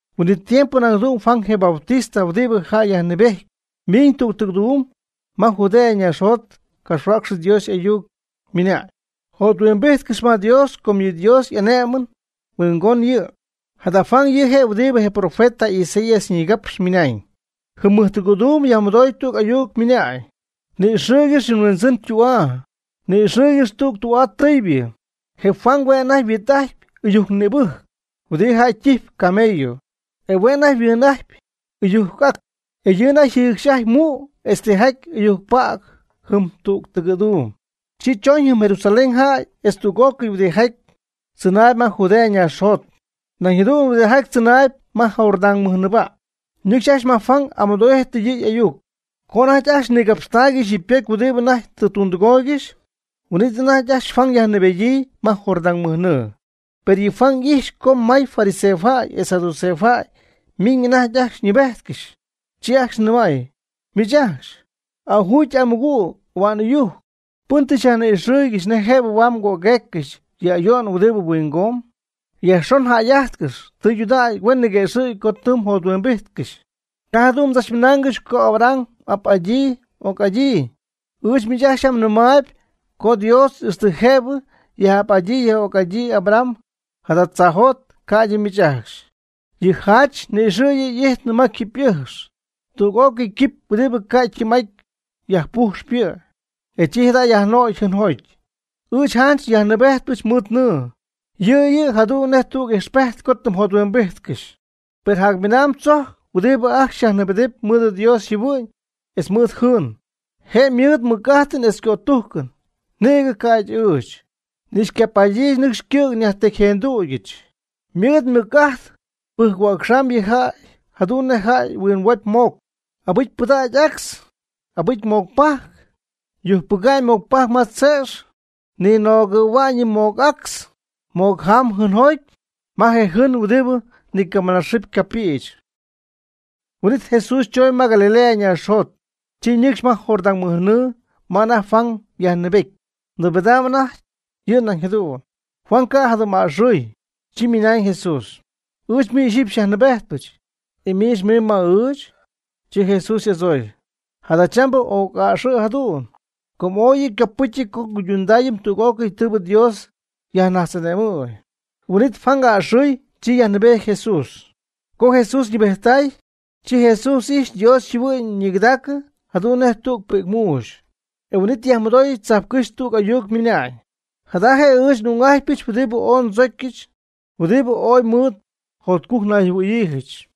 Huin'it tiempo nañ jadu'n Juan je Bautista (huɨdibɨ jäy yajnɨɨbejtpɨ) ymiñ tüg tɨgɨ̈dum ma Judea ñaaxjot capxhuäcx Dios y'ayuc, ymɨnañ: ―Jothuimbíjtcɨx ma Dios com yɨ Dios y'ane'mɨn huingonɨñ yɨ'. Jada Juan yɨ' je' huɨdibɨ je profeta Isaías nigapxy ymɨnañ: Jɨm mɨjtɨgɨ̈dum yajmɨdoy tüg ayuc mɨna'ñ: “Ni'ixɨɨygɨxy yɨ mHuindzɨn ytü'aa, ni'ixɨɨygɨxy tüg tü'aa tɨɨybɨ.” Je Juan hue' anajty yhuit'ajtpy ɨyujc nïbɨjc (huɨdibɨ jäy ytijpy camello) e hue' anajty yhuɨɨnɨp ɨyujc ac, e yɨ' anajty yjɨcxy'ajtpy mu' etz tijaty ɨyujc päg jɨm tüg tɨgɨ̈duum. Chi chooñ jɨm Jerusalén jäy etz tüg'ócɨy huɨdijaty tzɨnaayb ma Judea ñaaxjot, nañ jadu'n huɨdijaty tzɨnaayb ma Jordán mɨjnɨɨba', ñɨcx ajcxy ma Juan amɨdo'íjtɨy yɨ' y'ayuc. Co anajty ajcxy nigapxtaaygɨxy yɨ ypocy huɨdi anajty tɨ tundɨgooygɨxy, huin'it anajty ajcxy Juan yajnɨɨbedyii ma Jordán mɨj nɨɨ. Per yɨ Juan y'ix co may fariseo jäy etz saduceo jäy miñ anajty ajcxy nɨɨbejtcɨxy, chi ajcxy nɨmay: ―¡Miich ajcxy, m'ajuugy m'amɨgüg ahua'n ɨyujc! ¿Pɨn tɨ xyajni'ixɨɨygɨxy nej jëbɨ huaad mgögueeccɨxy yɨ ayo'n huɨdibɨ huingomb? Yajxon jäy'ajtcɨx tɨydudägy huen niguëxɨ̈gy co tɨ mjothuimbijtcɨxy. Ca' jadu'n mdzachmɨnaangɨxy co Abraham xy'ap'adyii xy'oc'adyii. Ɨɨch miich ajcxy yam ndɨmnɨmaayb co Dios ixtɨ jëbɨ yɨ' yaj'ap'adyii yaj'oc'adyii Abraham jada tzaajot ca'ydɨ miich ajcxy. Yɨ jach ni'ixɨ̈ yɨ' y'ijtnɨ ma quipy y'ɨjx, tüg'ócɨy quipy huɨdi ca' oy ytɨm'aty yajpujxp yɨ', e chi jada' yajnögy jɨɨnjoty. Ɨɨch, janch yajnɨɨbejtpɨch mɨɨd nɨɨ, yɨ' yɨ' jadu'n nej tüg ixpejt co tɨ mjothuimbijtcɨxy; per jacminamb tzojc huɨdi ajcxy xyajnɨɨbedɨpy mɨɨd Dios yjɨhuɨ'ñ etz mɨɨd jɨɨn. Je' ymɨɨd mɨc'ajtɨn etz cötujcɨn, nïgɨ ca'ydɨ ɨɨch, ni xycapaadyɨch nɨcxy ycɨ̈g nyajtecyjendügyɨch. Ymɨɨd mɨc'ajtɨn pɨjc-huäcxamy yɨ jäy jadu'n nej jäy huimbojy moc, abɨcy pɨdäga'ñ actz, abɨcy moc pajc. Yujcpɨga'ñ moc pajc ma tze'x ninögɨ̈hua'ñ yɨ moc actz moc jaam jɨɨnjoty ma je jɨɨn huɨdibɨ nicamɨnaaxɨɨ ycapïch. Huin'it Jesús chooñ ma Galilea ñaaxjot, chi ñɨcxy ma Jordán mɨj nɨɨ ma anajty Juan yjäyyajnɨɨbety, nɨɨbedam anajty yɨ' nañ jadu'n. Juan ca'jadɨm'a'ɨxɨ̈y, chi nɨmay Jesús: ―Ɨɨch miich ixyipy xyajnɨɨbejtpɨch, ¿e miich mimb ma ɨɨchɨ? Chi Jesús y'adzooy: ―Jadachambɨ oc'a'ɨxɨ̈ jadu'n, com ooy yɨ' ycopɨtyɨty co nguydundayɨm tüg'ócɨy tɨɨbɨ Dios xyaj'ane'mɨm. Huin'it Juan a'ɨxɨɨy chi yajnɨɨbejty Jesús. Co Jesús ñɨɨbejttay, chi Jesús ijxy Dios yjɨhuɨ'ñ ñigɨdägyii jadu'n nej tüg pi'cmuuxy. E huin'it yajmɨdoy tzajpcɨ́xy tüg ayuc ymɨna'ñ: ―Jada je' ɨɨch n'ung'ajtypɨch huɨdibɨ ooy ndzocyɨch huɨdibɨ ooy mɨɨd jotcujc nayjɨhuɨ̈yiijɨch.